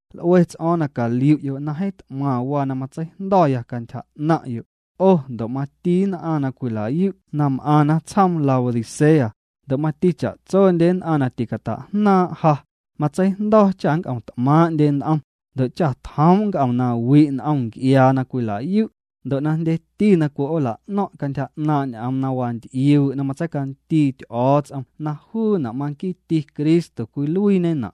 L'ue ts'o̱o̱ⁿ na caliu'yo' na jeeⁿ t'maⁿ waa na matseijndo̱ya cantyja 'naⁿ'yo', 'o ndo' mati nn'aⁿ na cwila'yu' na m'aⁿna tsjoom Laodicea, ndo' mati cha'tsondye nn'aⁿ na ticata'jnaaⁿ' ja, matseijndo̱ cha nnc'om t'maaⁿndye n'om, ndo' cha tjoom' nc'om na wi' n'om nc'iaa na cwila'yu', ndo' na jndyeti na cwi'oola'no̱ⁿ' cantyja 'naaⁿ' ñ'oom wanty'iuu' na matseicandii Ty'o̱o̱ts'om na juuna' maquiiti Cristo cwiluiiñena'.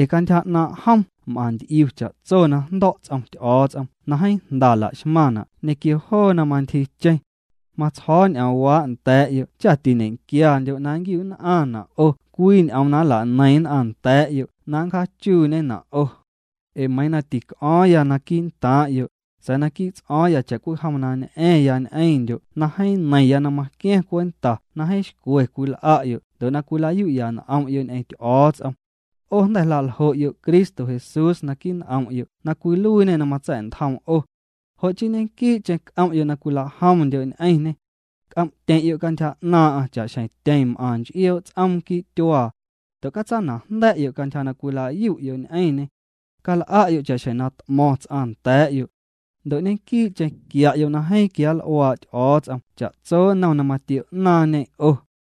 Ee cantyja 'naaⁿ' jom m'aⁿ nty'iu cha'tso na jndo̱' ts'om Ty'o̱o̱ts'om na jeeⁿ jnda laxmaⁿna' ñequio joo na mantyjiicheⁿ. Matsjo̱o̱ ñ'oomwaa' nda̱a̱'yo' cha tiñe'quiandyo' na nñe'quiu'nn'aⁿna' 'o cwii ñ'oom na nla'neiⁿ nn'aⁿ nda̱a̱'yo' na nncjaachuuñena' 'o. Ee meiiⁿ na tic'o̱o̱ⁿya quii'ntaaⁿ'yo', sa̱a̱ naquii' ts'o̱o̱ⁿya cha'cwijom na ñ'a̱ⁿya ñ'eⁿndyo' na jeeⁿ neiⁿya na maqua̱ⁿ cwenta na jeeⁿ xcwe cwil'a'yo' ndo' na cwila'yu'ya n'om'yo' ñ'eⁿ Ty'o̱o̱ts'om. 'O jnda̱ jla'ljo'yo' Cristo Jesús naquii' n'om'yo' na cwiluiiñê na matsa̱'ntjoom 'o. Jo' chii ñequii'cheⁿ c'om'yo' na cwila'jomndyo' ñ'eⁿñê. C'om'tyeⁿ'yo' cantyja 'naaⁿ'aⁿ cha'xjeⁿ tyeⁿ m'aⁿ nch'ioo' ts'oom quii' tyuaa. Ndo' catsana'jnda̱'yo' cantyja na cwila'yu'yo' ñ'eⁿñê. Cal'a'yo' cha'xjeⁿ ñ'oom na t'mo̱ⁿ ts'aⁿ nda̱a̱'yo'. Ndo' ñequii'cheⁿ quia'yo' na jeeⁿ quianl'uaa' Ty'o̱o̱ts'om cha'tso nnom na matio'naaⁿñê 'o.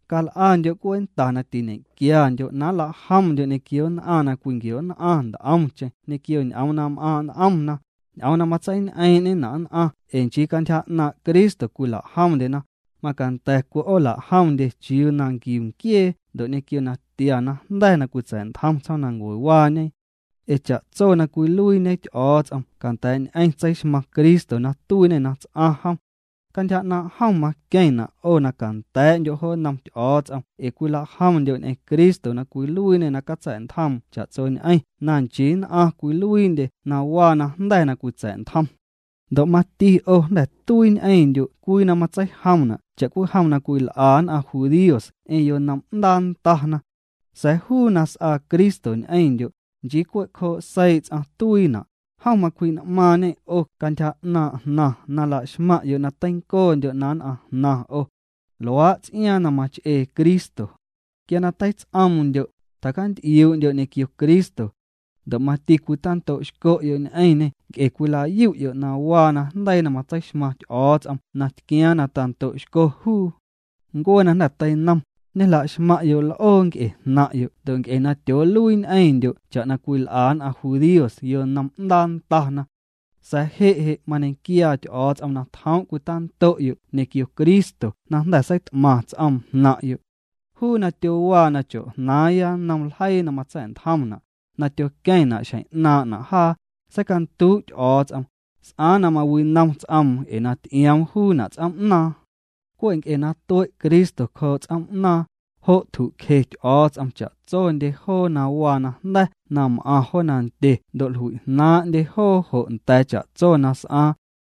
Cal'andyo' cwenta na tiñequiandyo' na nla'jomndyo' ñequio nn'aⁿ na cwinquio'nn'aⁿ nt'omcheⁿ ñequio ñ'oom na m'aaⁿ' n'omna, ñ'oom na matseiñ'eeⁿ'ñena' nn'aⁿ ee nchii cantyja 'naaⁿ' Cristo cwila'jomndyena, macanda̱ cwi'oola'jomndye chiuu na nquiu nquiee ndo' ñequio natia najnda̱ na cwitsa̱'ntjom tsjoomnancuewaañe. Ee cha'tso na cwiluiiñe Ty'o̱o̱ts'om canda̱a̱'ñ'eⁿ tseixmaⁿ Cristo na tuiiñê na ts'aⁿ jom. Cantyja 'naaⁿ' jom maqueⁿna' 'o na canda̱a̱'ndyo' jo nnom Ty'o̱o̱ts'om ee cwila'jomndyo' ñ'eⁿ Cristo na cwiluiiñê na catsa̱'ntjoom cha'tsondyeñ'eⁿ na nchii nn'aⁿ cwiluiindye na waa najnda̱ na cwitsa̱'ntjom. Ndo' mati 'o jnda̱ tuii ñ'eⁿndyo' cwii na matseijomna' cha'cwijom na cwil'a nn'aⁿ judíos ñ'eⁿ yonom'ndaa ndana. Sa̱a̱ juu na s'aa Cristo ñ'eⁿndyo', nchii cwe' cjoo' seii' ts'aⁿ tuiina', jom macwji'n'maaⁿñê 'o cantyja 'naaⁿ' jnaⁿ na laxmaⁿ'yo' na teincoondyo' na nn'aⁿjnaⁿ 'o. Luaa' ts'iaaⁿ na mach'ee Cristo. Quia na teits'oomndyo', tjacant'iuu'ndyo' ñequio Cristo. Ndo' mati cwitando'xco'yo' ñ'eⁿñê nc'e cwila'yu'yo' na waa najndeii na matseixmaⁿ Ty'o̱o̱ts'om na tquiaaⁿ na tando'xco juu. Ncuee na jnda̱ teinom, ñejla'xmaⁿ'yo' l'oo nc'e jnaⁿ'yo' ndo' nc'e na tyooluii ñ'eⁿndyo' cha'na cwil'a nn'aⁿ judíos yonom'ndaa ndana. Sa̱a̱ je' je' mañequiaa Ty'o̱o̱ts'om na tjoom' cwitando'yo' ñequio Cristo na jnda̱ seit'maⁿ ts'oom jnaⁿ'yo'. Juu na tyowaa na cho̱'jnaaⁿya nnom ljeii na matsa̱'ntjomna', na tyoqueⁿna' xjeⁿ 'naaⁿ'na' jaa, seicanduu' Ty'o̱o̱ts'om. S'aaⁿ na mawinom ts'oom ee na ty'ioom juuna' ts'oom'naaⁿ. Cwe' nc'e na tue' Cristo cjoo' ts'oom'naaⁿ, jo' tju'cje Ty'o̱o̱ts'om cha'tsondye joo na waa najnda̱ na m'aⁿ jo nandye ndo' jlui'jnaaⁿ'ndye joo jo nda̱a̱ cha'tso na s'aaⁿ.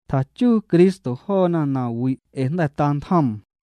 Tjachuu Cristo joona nawi' ee na jnda̱ tantjoom.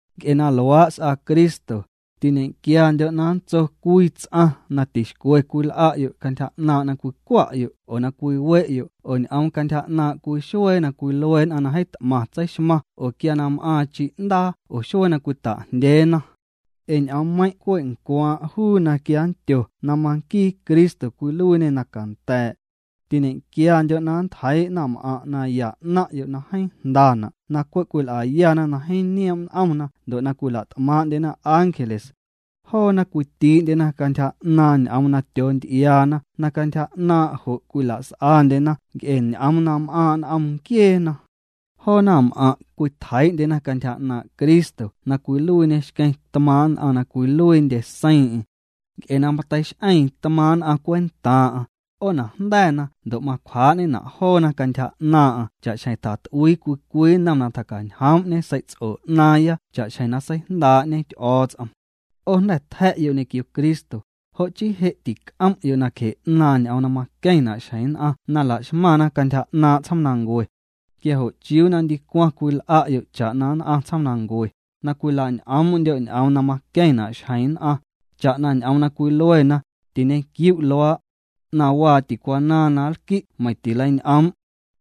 Nc'e na luaa' s'aa Cristo, tiñequiandyo' na nntso cwii ts'aⁿ na tixcwe cwil'a'yo' cantyja 'naaⁿ' na cwicwa'yo' oo na cwiwe'yo' oo ñ'oom cantyja 'naaⁿ' cwii xuee na cwilue nn'aⁿ na jeeⁿ t'maⁿ tseixmaⁿ oo quia na m'aaⁿ chi'ndaa oo xuee na cwita'jndyeena. Ee ñ'oommeiⁿ' cwe' ncwaaⁿ' juu na quia nndyo na manquii Cristo cwiluiiñê na canda̱a̱'. Tiñe'quiandyo' na nntjeii' naⁿm'aⁿ' naya 'naⁿ'yo' na jeeⁿ jndana' na cwe' cwil'ayana na jeeⁿ nioom' n'omna ndo' na cwila't'maaⁿ'ndyena ángeles. Joona cwitii'ndyena cantyja 'naaⁿ ñ'oom na tyoonty'iaana na cantyja 'naaⁿ' jo' cwila's'andyena nc'e ñ'oom na m'aaⁿ' n'om nquieena. Joo naⁿm'aⁿ' cwitjeii'ndyena cantyja 'naaⁿ' Cristo na cwiluiiñê xqueⁿ tmaaⁿ' nn'aⁿ na cwiluiindye seiiⁿ'eⁿ. Nc'e na mateix'eeⁿ tmaa'ⁿ nn'aⁿ cwentaa'aⁿ', 'oonajnda̱na ndo' macwjaa'ñena' joona cantyja 'naaⁿ'aⁿ cha'xjeⁿ tjat'uii cwii cwii nnom na tjacañjoom'ñe sei'ts'o 'naaⁿya cha'xjeⁿ na seijndaa'ñe Ty'o̱o̱ts'om. 'O jnda̱ tja̱'yo' ñequio Cristo, jo' chii je' tic'om'yo' nacje 'naaⁿ ñ'oom na maqueⁿna' xjeⁿ nn'aⁿ na la'xmaⁿna cantyja 'naaⁿ' tsjoomnancue. Quia jo' ¿chiuu na ndicwaⁿ cwil'a'yo' cha'na nn'aⁿ tsjoomnancue, na cwilañ'oom'ndyo' ñ'oom na maqueⁿna' xjeⁿ nn'aⁿ? Cha'na ñ'oom na cwiluena: “Tiñe'quiu' luaa'. 'Naⁿwaa' ticwanaaⁿ na nlqui' meiⁿ tileiñ'oom'”.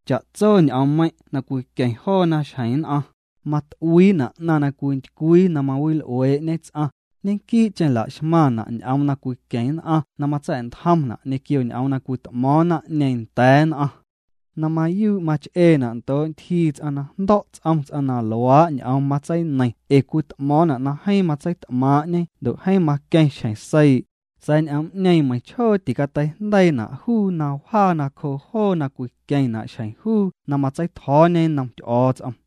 Cha'tso ñ'oommeiⁿ' na cwiqueⁿ joona xjeⁿ nn'aⁿ, mat'uiina' 'naⁿ na cwintycwii na mawil'uee'ñe ts'aⁿ, ñequii'cheⁿ la'xmaⁿna' ñ'oom na cwiqueⁿ nn'aⁿ na matsa̱'ntjomna' ñequio ñ'oom na cwit'mo̱o̱ⁿ naⁿ'ñeeⁿ nda̱a̱ nn'aⁿ. Na mayuu' mach'eena' ndoo' ntyjii ts'aⁿ na jndo̱' ts'om ts'aⁿ na luaa' ñ'oom tseineiⁿ ee cwit'mo̱o̱ⁿna' na jeeⁿ matseit'maaⁿ'ñe ndo' jeeⁿ maqueⁿ xjeⁿ seii', sa̱a̱ ñ'oom'ñeeⁿ meiⁿchjoo ticateijndeiina' juu na wjaa nacjoo joo na cwiqueⁿna' xjeⁿ juu na matsei'tjo̱o̱ñe nnom Ty'o̱o̱ts'om.